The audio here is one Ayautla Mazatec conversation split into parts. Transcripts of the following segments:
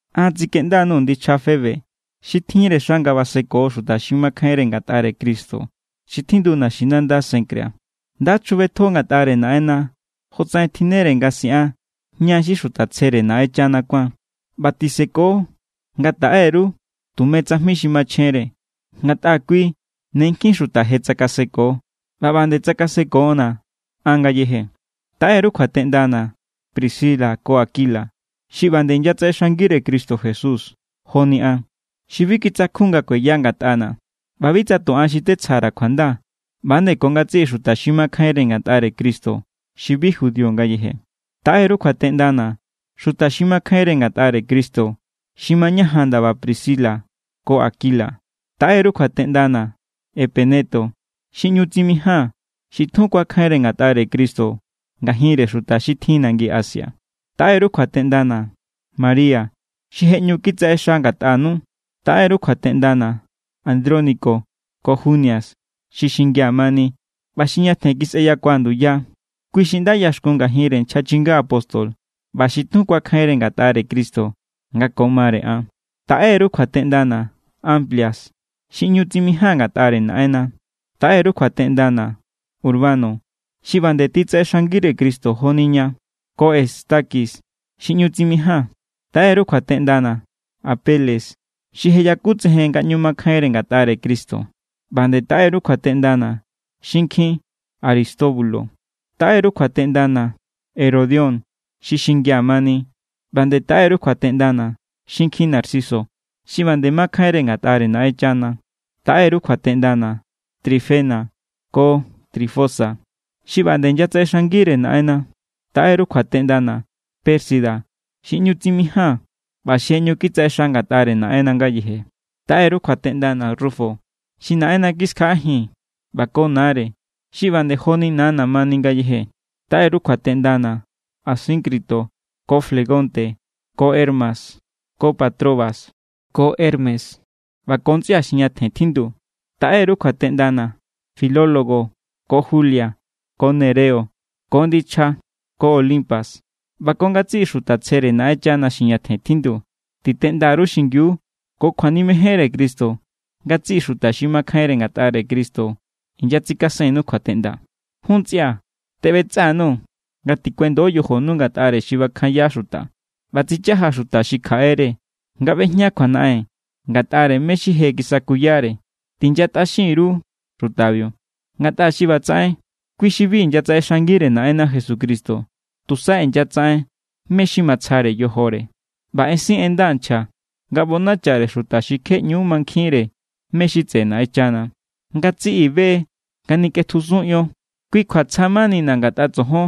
An tsikeꞌnda_nuu̱ ndichja Febe xi tjinre xa nga baseko xuta xi makjainre ngatꞌare Cristo xi tjindu naxinanda Cencrea. Nda chjubetjo ngatꞌare Naꞌenna jotsaꞌen tjinnere nga siꞌan ña xi xuta tsjere Naꞌenchana kuáan. ꞌBa tiseko nga taꞌe_ru tume tsajmi xi machjenre. Ngatꞌa kui ne nkjin xuta je tsakaseko ꞌba ꞌba nde tsakasekona̱ an ngayeje. Taꞌe_ru kjuateꞌndana̱ Priscila ko Aquila, xi ꞌba nde inyatsaꞌexangire Cristo Jesús joni an. Xi bi kitsakjun nga kueya ngatꞌana̱. ꞌBa bi tsa tu an xi tetsja_ra̱ kjuanda, ꞌba=nde ko ngatsiꞌi xuta xi makjainre ngatꞌare Cristo xi bi judío ngayeje. Taꞌe_ru kjuateꞌndana̱ xuta xi makjainre ngatꞌare Cristo xi mañajan ndaba Priscila ko Aquila. Taꞌe_ru kjuateꞌndana̱ Epeneto, xi ꞌñu tsimijáa̱n, xi tjun kuakjainre ngatꞌare Cristo ngajinre xuta xi tjin nangi Asia. Taꞌe_ru kjuateꞌndana̱ María, xi je ꞌñu kitsaꞌexa ngatꞌanu. Taꞌe_ru kjuateꞌndana̱ Andrónico ko Junias, xi xingia̱ mani ꞌba xi ñatjen kisꞌeyakua̱ nduya. Kui xi nda ꞌyaxkun ngajinre nchja chinga apóstol ꞌba xi tjun kuakjainre ngatꞌare Cristo nga ko mare an. Taꞌe_ru kjuateꞌndana̱ Amplias, xi ꞌñu tsimijáa̱n ngatꞌare Naꞌenna. Taꞌe_ru kjuateꞌndana̱ Urbano, xi ꞌba nde titsaꞌexangire Cristo joni ña, ko Estaquis, xi ꞌñu tsimijáa̱n. Taꞌe_ru kjuateꞌndana̱ Apeles, xi je yakutsejen nga ꞌñu makjainre ngatꞌare Cristo. ꞌBa nde taꞌe_ru kjuateꞌndana̱ xinkjin Aristóbulo. Taꞌe_ru kjuateꞌndana̱ Herodión, xi xingia̱ mani. ꞌBa nde taꞌe_ru kjuateꞌndana̱ xinkjin Narciso, xi ꞌba nde makjainre ngatꞌare Naꞌenchana. Taꞌe_ru kjuateꞌndana̱ Trifena ko Trifosa, xi ꞌba nde inyatsaꞌexangire Naꞌenna. Taꞌe_ru kjuateꞌndana̱ Pérsida, xi ꞌñu tsimijáa̱n ꞌba xi je ꞌñu kitsaꞌexa ngatꞌare Naꞌenna ngayeje. Taꞌe_ru kjuateꞌndana̱ Rufo, xi Naꞌenna kiskjaꞌajin, ꞌba ko nare, xi ꞌba nde joni nana̱ mani ngayeje. Taꞌe_ru kjuateꞌndana̱ Asíncrito ko Flegonte ko Hermes ko Patrobas ko Hermas ꞌba ko ntsꞌia xi ñatjen tjindu. Taꞌe_ru kjuateꞌndana̱ Filologo ko Julia ko Nereo ko ndichja ko Olimpas ꞌba ko ngatsiꞌi xuta tsjere Naꞌenchana xi ñatjen tjindu. Titeꞌnda_ru xingiu ko kjuanimejenre Cristo. Ngatsiꞌi xuta xi makjainre ngatꞌare Cristo inyatsikasennu kjuateꞌnda. Jun ntsꞌia̱, teꞌbetsꞌa_nuu̱ nga tikuendo yojonu ngatꞌare xi bakjanya xuta ꞌba tsichaja xuta xi kjaꞌere nga ꞌbejña kjuanaꞌen ngatꞌare mé= xi je kisakuyare. Tinyatꞌaxin_ru xutabiu. Ngatꞌa xi ꞌbatsaꞌen, kui xi bi inyatsaꞌexangire Naꞌenna Jesucristo, tusa inyatsaꞌen mé= xi matsjare yojore. ꞌBa ensin en nda nchja nga ꞌbonachare xuta xi kje ꞌñu= mankjinjínre mé= xi tseꞌe Naꞌenchana. Ngatsiꞌi be= nga nikꞌetjusun ion. Kui kjua tsja manina̱ ngatꞌa tsojon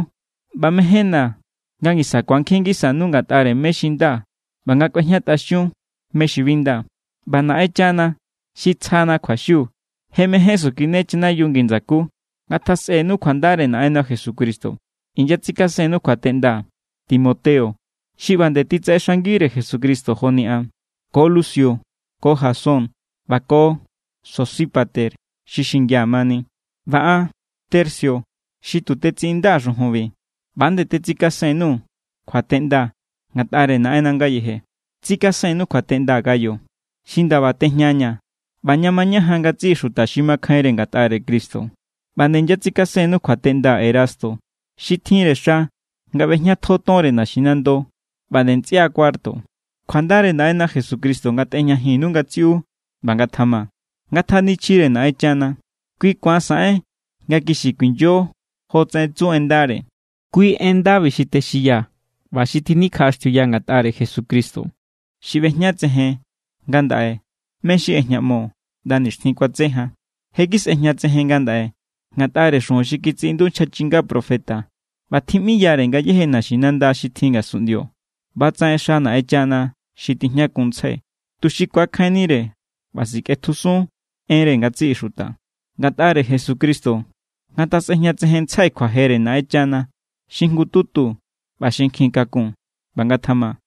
ꞌba mejénna̱ nga ngisa ku̱ankjin ngisanu ngatꞌare mé= xi nda ꞌba nga kꞌuejñatꞌaxiun mé= xi bi nda. ꞌBa Naꞌenchana xi tsjana kjuaxiu je mején sukine chanayiu ngi ndsakú. Ngatjasꞌenu kjuandare Naꞌenna Jesucristo. Inyatsikasennu kjuateꞌnda Timoteo, xi ꞌba nde titsaꞌexangire Jesucristo joni an, ko Lucio ko Jasón ꞌba ko Sosípater, xi xingia̱ mani. ꞌBa an Tercio xi tu tetsiꞌindaa̱ xujunbi, ꞌba=nde tetsikasen_nuu̱ kjuateꞌnda ngatꞌare Naꞌenna ngayeje. Tsikasennu kjuateꞌnda Gayo, xi ndaba tejñaña̱ ꞌba ña mañajan ngatsiꞌi xuta xi makjainre ngatꞌare Cristo. ꞌBa nde inyatsikasennu kjuateꞌnda Erasto, xi tjinre xa nga ꞌbejñatjo tonre naxinando, ꞌba nde ntsꞌia Cuarto. Kjuandare Naꞌenna Jesucristo ngatꞌejñajinnu ngatsiꞌu. ꞌBa ngatjama. Ngatjanichjire Naꞌenchana. Kui ku̱an saꞌen nga kixi kuinyo jotsaꞌen tsu en ndare. Kui en ndabi xi texinyaa̱ ꞌba xi tjinikjaꞌaxtiuya ngatꞌare Jesucristo. Xi ꞌbejñatsejen ngandaꞌe mé= xi ꞌejñaꞌmo ꞌnda nixtjin kuatse jan. Je= kisꞌejñatsejen ngandaꞌe ngatꞌare xujun xi kitsiꞌindu nchja chinga profeta ꞌba tjiꞌmiyare ngayéje naxinanda xi tjin ngasunꞌndio. ꞌBatsaꞌen ꞌexa Naꞌenchana xi tijñakunntsjai, tuxi ku̱akjainnire ꞌba sikꞌetjusun enre ngatsiꞌi xuta. Ngatꞌare Jesucristo ngatjasꞌejñatsejenntsjai kjuajere Naꞌenchana xi jngututu ꞌba xi nkjin kakun. ꞌBa ngatjama.